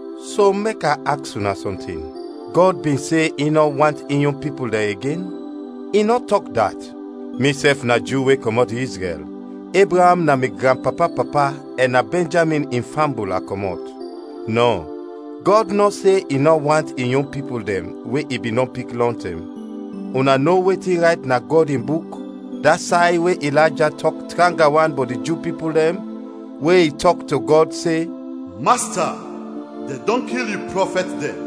So mek a aks una sɔntin: Gɔd bin se i nɔ want in yon pipul dɛn igen? I nɔ tɔk dat! Misɛf na Ju we kɔmɔt Izrɛl, Ebraam na mi granpapa-papa ɛn na Bɛnjamin in fambul a kɔmɔt. Nɔ, Gɔd nɔ se in nɔ want in yon pipul dɛn we i bin dɔn pik lɔntɛm. Una no wetin rayt na Gɔd in Buk, da say we Ilayja tɔk tranga wan bɔt di Ju pipul dɛn, we i tɔk to Gɔd se: “Masta, dɛn dɔn kil yu prɔfɛt dɛn,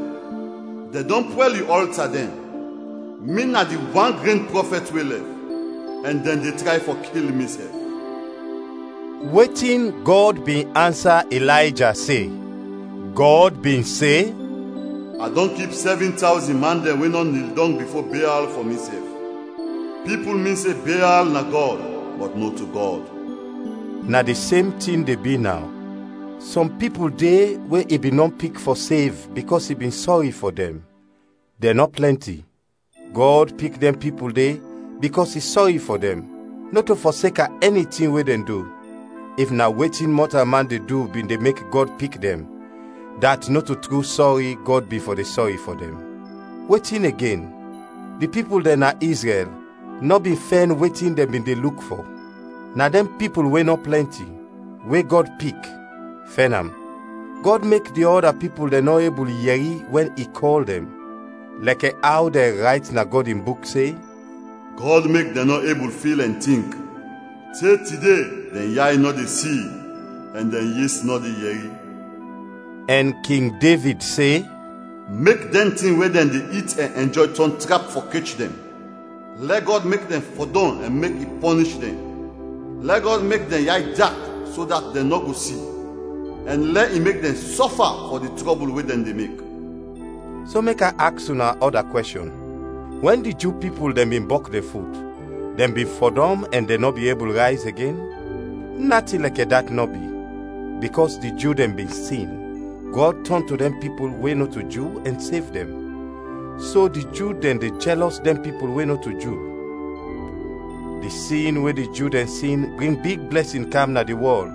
dɛn dɔn pwɛl yu ɔlta dɛn; mi na di wan gren prɔfɛt we lɛf, ɛn dɛn de tray fɔ kil misɛf.” Wetin Gɔd bin ansa Ilayja se? Gɔd bin se, “A dɔn kip sɛvin tawzin man dɛn we nɔ nil dɔng bifo Beal fɔ misɛf, pipul min se Beal na Gɔd, bɔt nɔto Gɔd.” Na di sem tin de bi naw; sɔm pipul de we i bin dɔn pik fɔ sev bikɔs i bin sɔri fɔ dɛn, dɛn nɔ plɛnti. Gɔd pik dɛn pipul de bikɔs i sɔri fɔ dɛn, nɔto fɔseka ɛni tin we dɛn du. If na wetin mɔtalman de du bin de mek Gɔd pik dɛn, dat nɔto tru sɔri Gɔd bin fɔ de sɔri fɔ dɛn. Wetin igen? Di pipul dɛn na Izrɛl nɔ bin fɛn wetin dɛn bin de luk fɔ. Na dɛn pipul we nɔ plɛnti, we Gɔd pik, fɛn am. Gɔd mek di ɔda pipul dɛn nɔ ebul yɛri wɛn i kɔl dɛn. Lɛkɛ aw dɛn rayt na Gɔd in Buk se, “Gɔd mek dɛn nɔ ebul fil ɛn tink; te tide dɛn yay nɔ de si ɛn dɛn yes nɔ de yɛri.” Ɛn King Devid se: “Mek dɛn tin we dɛn de it ɛn ɛnjɔy tɔn trap fɔ kech dɛn; lɛ Gɔd mek dɛn fɔdɔm ɛn mek i pɔnish dɛn! Lɛ Gɔd mek dɛn yay dak so dat dɛn nɔ go si; ɛn lɛ i mek dɛn sɔfa fɔ di trɔbul we dɛn de mek.” So, mek a aks una ɔda kwɛshɔn: Wɛn di Ju pipul dɛn bin bɔk dɛn fut, dɛn bin fɔdɔm ɛn dɛn nɔ bin ebul rayz igen? Natin lɛkɛ dat nɔ bi! Bikɔs di Ju dɛn bin sin, Gɔd tɔn to dɛn pipul we nɔto Ju ɛn sev dɛn, so di Ju dɛn de jɛlɔs dɛn pipul we nɔto Ju. Di sin we di Ju dɛn sin bring big blɛsin kam na di wɔl,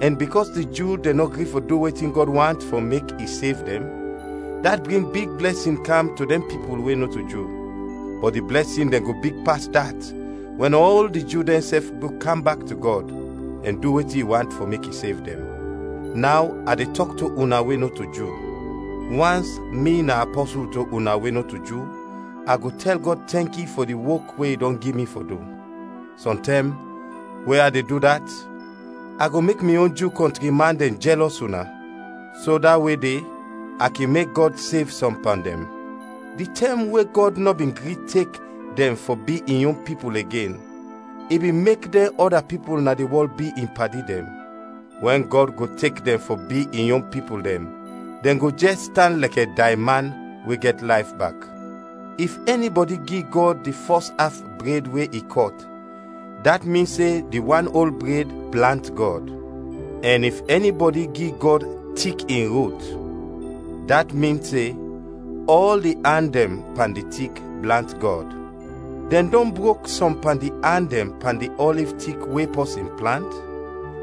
ɛn bikɔs di Ju dɛn nɔ gri fɔ du wetin Gɔd want fɔ mek i sev dɛn, dat bring big blɛsin kam to dɛn pipul we nɔto Ju. Bɔt di blɛsin dɛn go big pas dat wɛn ɔl di Ju dɛnsɛf go kam bak to Gɔd ɛn du wetin i want fɔ mek i sev dɛn. Naw a de tɔk to una we nɔto Ju: Wans mi na apɔsul to una we nɔto Ju, a go tɛl Gɔd tɛnki fɔ di wok we i dɔn gi mi fɔ du. Sɔntɛm, we a de du dat, a go mek mi yon Ju kɔntri man dɛn jɛlɔs una, so da we de a kin mek Gɔd sev sɔm pan dɛn. Di tɛm we Gɔd nɔ bin gri tek dɛn fɔ bi in yon pipul igen, i bin mek dɛn ɔda pipul na di wɔl bi in padi dɛn. Wɛn Gɔd go tek dɛn fɔ bi in yon pipul dɛn, dɛn go jɛs tan lɛkɛ dayman we gɛt layf bak. If ɛnibɔdi gi Gɔd di fɔs af bred we i kɔt, dat min se di wan ol bred blant Gɔd; ɛn if ɛnibɔdi gi Gɔd tik in rut, dat min se ɔl di an dɛn pan di tik blant Gɔd. Dɛn dɔn brok sɔm pan di an dɛn pan di ɔliv tik we pɔsin plant,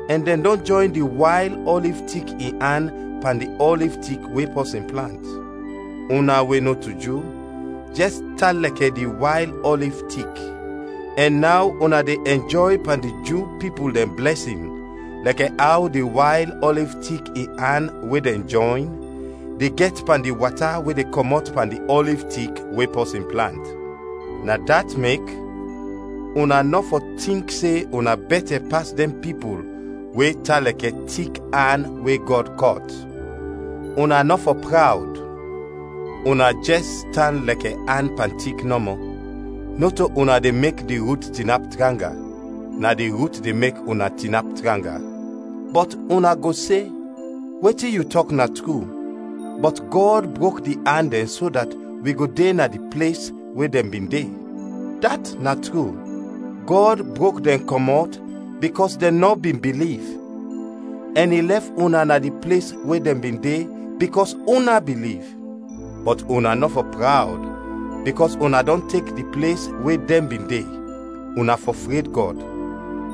ɛn dɛn dɔn jɔyn di wayl ɔliv tik in an pan di ɔliv tik we pɔsin plant. Una we nɔto Ju jɛs tan lɛkɛ di wayl ɔliv tik, ɛn naw una de ɛnjɔy pan di Ju pipul dɛn blɛsin lɛkɛ aw di wayl ɔliv tik in an we dɛn jɔyn, de gɛt pan di wata we de kɔmɔt pan di ɔliv tik we pɔsin plant. Na dat mek, una nɔ fɔ tink se una bɛtɛ pas dɛn pipul we tan lɛkɛ tik an we Gɔd kɔt. Una nɔ fɔ prawd! Una jɛs tan lɛkɛ an pan tik nɔmɔ, nɔto una de mek di rut tinap tranga, na di rut de mek una tinap tranga. Bɔt una go se, “Wetin yu tɔk na tru, bɔt Gɔd brok di an dɛn so dat wi go de na di ples we dɛn bin de.” Dat na tru! Gɔd brok dɛn kɔmɔt bikɔs dɛn nɔ bin biliv, ɛn i lɛf una na di ples we dɛn bin de, bikɔs una biliv. Bɔt una nɔ fɔ prawd bikɔs una dɔn tek di ples we dɛn bin de, una fɔ fred Gɔd.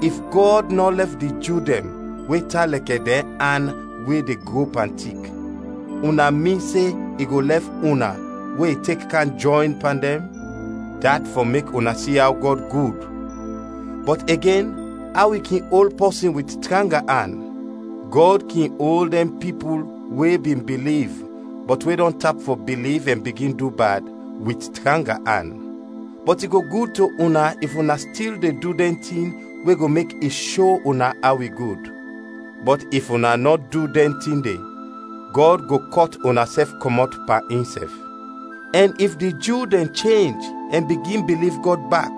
If Gɔd nɔ lɛf di Ju dɛn we tan lɛkɛ dɛn an we de gro pan tik, una min se i go lɛf una we i tek kam jɔyn pan dɛn? Dat fɔ mek una si aw Gɔd gud, bɔt igen aw i kin ol pɔsin wit tranga an. Gɔd kin ol dɛn pipul we bin biliv bɔt we dɔn tap fɔ biliv ɛn bigin du bad, wit tranga an, bɔt i go gud to una if una stil de du dɛn tin we go mek i sho una aw i gud; bɔt if una nɔ du dɛn tin de, Gɔd go kɔt unasɛf kɔmɔt pan insɛf. Ɛn if di Ju dɛn chenj ɛn bigin biliv Gɔd bak,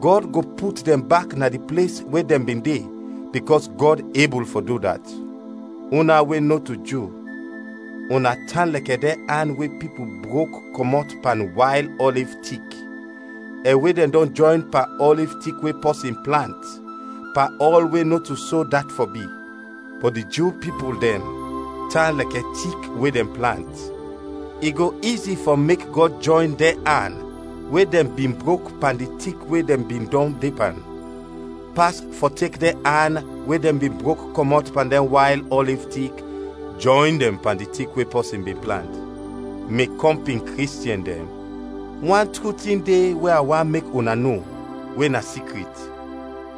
Gɔd go put dɛn bak na di ples we dɛn bin de, bikɔs Gɔd ebul fɔ du dat. Una we nɔto Ju, una tan lɛkɛ dɛn an we pipul brok kɔmɔt pan wayl ɔliv tik, ɛn we dɛn dɔn jɔyn pan ɔliv tik we pɔsin plant, pan ɔl we nɔto so dat fɔ bi. Bɔt di Ju pipul dɛn tan lɛkɛ tik we dɛn plant; i go izi fɔ mek Gɔd jɔyn dɛn an we dɛn bin brok pan di tik we dɛn bin dɔn de pan, pas fɔ tek dɛn an we dɛn bin brok kɔmɔt pan di wayl ɔliv tik, jɔyn dɛn pan di tik we pɔsin bin plant. Mi kɔmpin Kristiɛn dɛn, wan tru tin de we a want mek una no, we na sikrit.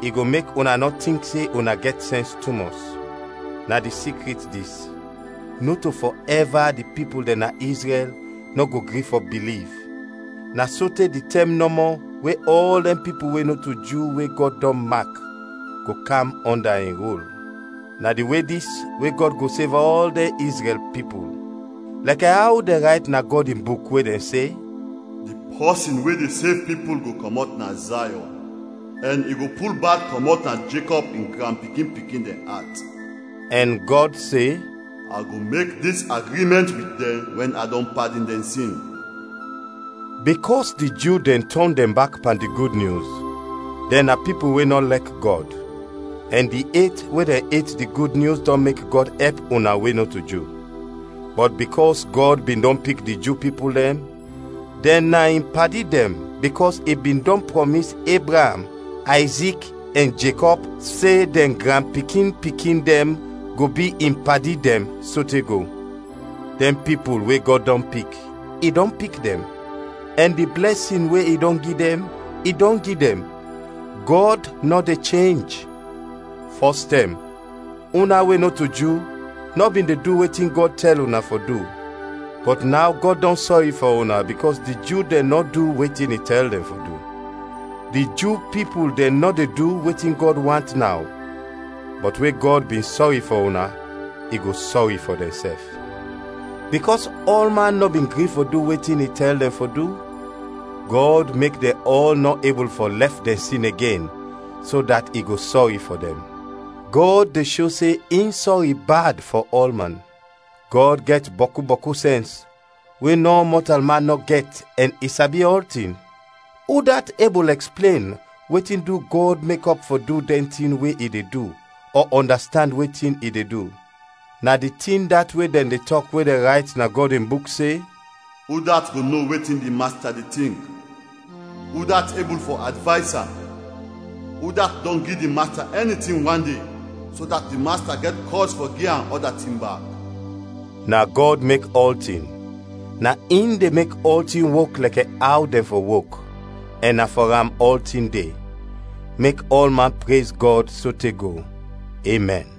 I go mek una nɔ tink se una gɛt sɛns tumɔs. Na di sikrit dis: Nɔto fɔɛva di pipul dɛn na Izrɛl nɔ go gri fɔ biliv, na sote di tɛm nɔmɔ we ɔl dɛn pipul we nɔto Ju we Gɔd dɔn mak, go kam ɔnda in rul. Na di we dis we Gɔd go sev ɔl dɛn Izrɛl pipul. Lɛkɛ aw dɛn rayt na Gɔd in Buk we dɛn se, “Di pɔsin we de sev pipul go kɔmɔt na Zayɔn, ɛn i go pul bad kɔmɔt na Jekɔb in granpikin-pikin dɛn at.” Ɛn Gɔd se, “A go mek dis agrimɛnt wit dɛn wɛn a dɔn padin dɛn sin.” Bikɔs di Ju dɛn tɔn dɛn bak pan di Gud Nyus, dɛn na pipul we nɔ lɛk Gɔd, ɛn di et we dɛn et di Gud Nyus dɔn mek Gɔd ɛp una we nɔto Ju. Bɔt bikɔs Gɔd bin dɔn pik di Ju pipul dɛn, dɛn na in padi dɛn bikɔs i bin dɔn prɔmis Ebraam, Ayzik ɛn Jekɔb se dɛn granpikin-pikin dɛn go bi in padi dɛn sote go. Dɛn pipul we Gɔd dɔn pik, i dɔn pik dɛn; ɛn di blɛsin we i dɔn gi dɛn, i dɔn gi dɛn. Gɔd nɔ de chenj. Fɔs tɛm una we nɔto Ju nɔ bin de du wetin Gɔd tɛl una fɔ du, bɔt naw Gɔd dɔn sɔri fɔ una bikɔs di Ju dɛn nɔ du wetin i tɛl dɛn fɔ du. Di Ju pipul dɛn nɔ de du wetin Gɔd want naw, bɔt we Gɔd bin sɔri fɔ una, i go sɔri fɔ dɛnsɛf. Bikɔs ɔlman nɔ bin gri fɔ du wetin i tɛl dɛn fɔ du, Gɔd mek dɛn ɔl nɔ ebul fɔ lɛf dɛn sin igen so dat i go sɔri fɔ dɛn. Gɔd de sho se in sɔri bad fɔ ɔlman! Gɔd gɛt bɔku, bɔku sɛns we nɔ mɔtalman nɔ gɛt ɛn i sabi ɔltin! Udat ebul ɛksplen wetin du Gɔd mekɔp fɔ du dɛn tin we i de du, ɔ ɔndastand wetin i de du? Na di tin dat we dɛn de tɔk we dɛn rayt na Gɔd in Buk se, “Udat go no wetin di Masta de tink? Udat ebul fɔ advays am? Udat dɔn gi di Masta ɛnitin wande, so dat di Masta gɛt kɔz fɔ gi am ɔda tin bak?” Na Gɔd mek ɔltin, na in de mek ɔltin wok lɛkɛ aw dɛn fɔ wok, ɛn na fɔ am ɔltin de. Mek ɔlman prez Gɔd sote go! Emɛn.